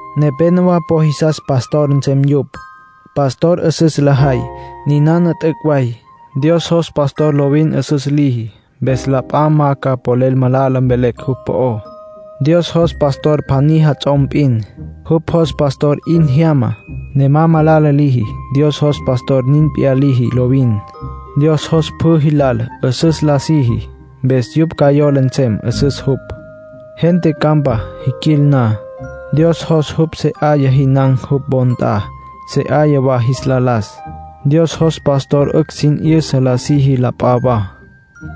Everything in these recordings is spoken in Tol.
Nepénowa po jisas pastorpan nsem yupj. Pastorpan 'üsüs lajay. Ninana t'üc' way. Dios jos pastor lovin 'üsüs liji. Mpes la p'a ma ca polel malala mvelecj jupj po'ó. Dios jos pastor pjaní jats'om p'in. Jupj jos pastor 'in jyama, ne ma malala liji. Dios jos pastor nin p'iyá liji lovin. Dios jos pjü jilal 'üsüs la siji, mpes yupj ca yola nsem 'üsüs jupj. Gente campa jiquil na, Dios jos jupj se 'aya jinan̈ jupj wo nt'a, se 'aya wa jis la las. Dios jos pastor 'ücj sin 'yüsa la siji la p'a wa.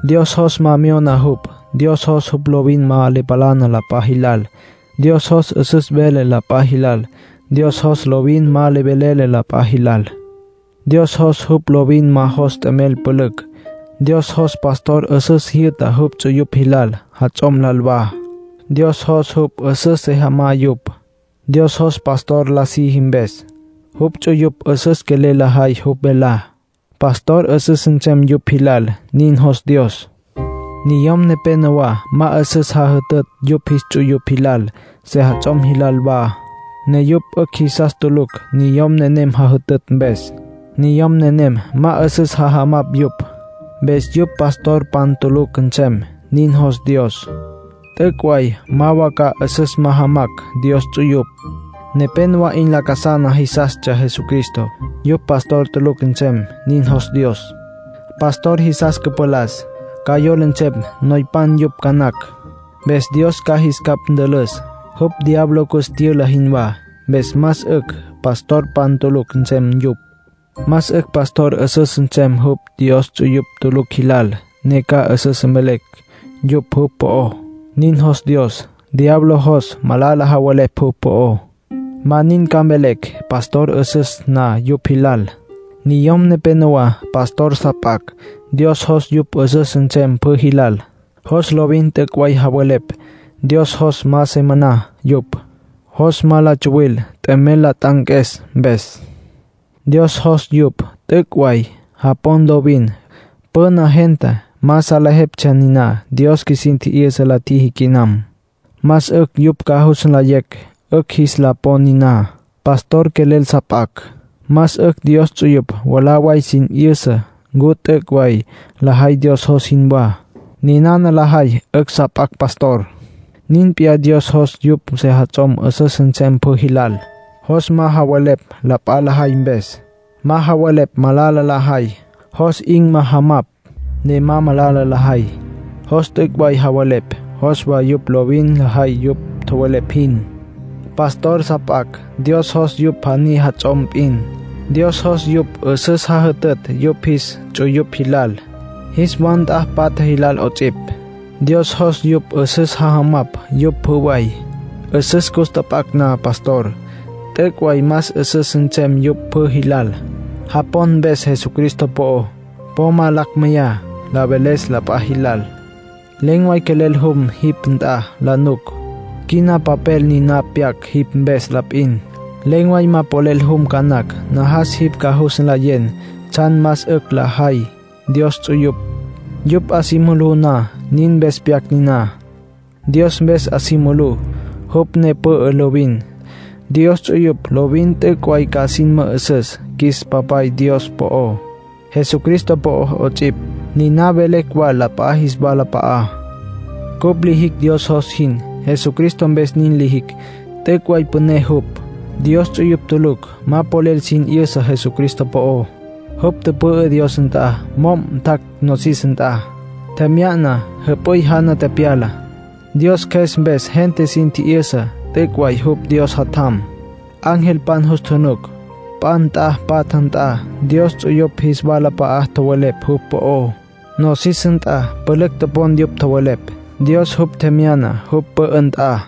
Dios jos ma myona jupj. Dios jos jupj lovin ma le palana la p'a jilal. Dios jos 'üsüs vele la p'a jilal. Dios jos lovin ma le velele la p'a jilal. Dios jos jupj lovin ma jos t'emel pülücj. Dios jos pastor 'üsüs jyü'ta jupj ts'uyupj jilal, jats'om lal wa. Dios jos jupj 'üsüs se jamá yupj. Dios jos pastor la siji mpes, jupj ts'uyupj 'üsüs quelel lajay jupj velá. Pastor 'üsüs nsem yupj jilal, nin jos Dios. Niyom nepénowa ma 'üsüs jajütütj yupj jis ts'uyupj jilal, sejats'om jilal wa, ne yupj 'ücj jisas tulucj niyom nenem jajütütj mpes. Niyom nenem ma 'üsüs jajamapj yupj. Mpes yupj pastorpan tulucj nsem, nin jos Dios; t'üc' way ma wa ca 'üsüs majamacj Dios ts'uyupj. Nepénowa 'in lacasana jisastsja Jesucristo. Yupj pastorpan tulucj nsem, nin jos Dios. Pastor jis cüpalas, ca yola nsem noypan yupj ca nacj. Mpes Dios ca jis capj ntülüs, jupj diablo cus tyüla jinwá. Mpes más 'ücj pastorpan tulucj nsem yupj. Más 'ücj pastor 'üsüs nsem jupj Dios ts'uyupj tulucj jilal, ne ca 'üsüs mvelecj yupj jupj po'ó. Nin jos Dios. Diablo jos malala javelepj jupj po'ó; ma nin ca mvelecj pastor 'üsüs na yupj jilal. Niyom nepénowa pastor sa p'acj. Dios jos yupj 'üsüs nsem pjü jilal. Jos lovin t'üc' way javelepj. Dios jos ma se maná yupj. Jos ma la tsuwil t'emel la t'anques mpes. Dios jos yupj t'üc' way japon lovin. Püna gente ma salejeptsja, niná Dios qjuisin tji'yüsa la tjiji quinam. Más 'ücj yupj ca jus nlayecj 'ücj jis la pon niná. Pastor quelel sa p'acj, más 'ücj Dios ts'uyupj mwalá way sin 'yüsa ncu t'üc' way lajay Dios jos jinwá. Ninana lajay, 'ücj sa p'acj pastor. Nin p'iyá Dios jos yupj sejats'om 'üsüs nsem pjü jilal. Jos ma javelepj la p'a lajay mpes, ma javelepj malala lajay. Jos 'in jajamapj ne ma malala lajay. Jos t'üc' way javelepj, jos wa yupj lovin lajay yupj tjowelepj jin. Pastor sa p'acj, Dios jos yupj pjaní jats'om p'in. Dios jos yupj 'üsüs jajütütj yupj jis ts'uyupj jilal, jis wa nt'a patja jilal 'ots'ipj. Dios jos yupj 'üsüs jajamapj yupj pjü way. 'Üsüs cus tjap'acj na pastor, t'üc' way más 'üsüs nsem yupj pjü jilal. Japon mpes Jesucristo po'ó, po ma lacj meyacj la veles la p'a jilal. Len̈ way quelel jum jipj nt'a la nuc. Quina papel niná pyac jipj mpes la p'in; len̈ way ma polel jum ca nacj. Najas jipj ca jus nlayen tsjan más 'ücj lajay Dios ts'uyupj, yupj 'a si mulú na; nin mpes pyac niná. Dios mpes 'a si mulú, jupj ne pü'ü lovin. Dios ts'uyupj lovin t'üc' way ca sin mü'üsüs qjuis Papay Dios po'ó, Jesucristo po'ó 'ots'ipj. Niná mvelecj wa la p'a jis walap'a'á. Cupj lijicj Dios jos jin. Jesucristo mpes nin lijicj. T'üc' way püné jupj. Dios ts'uyupj tulucj ma polel sin 'yüsa Jesucristo po'ó. Jupj tüpü'ü Dios nt'a mo'm tjac' nosis nt'a. Tjemya'na, jüp'üy jana tepyala. Dios Cjües mpes gente sin tji'yüsa t'üc' way jupj Dios Jatjam. Angelpan jus tjunuc. P'a nt'a patja nt'a Dios ts'uyupj jis walap'a'a tjowelepj jupj po'ó. Nosis nt'a pülücj topon yupj tjowelepj. Dios jupj tjemyana jupj pü'ü nt'a.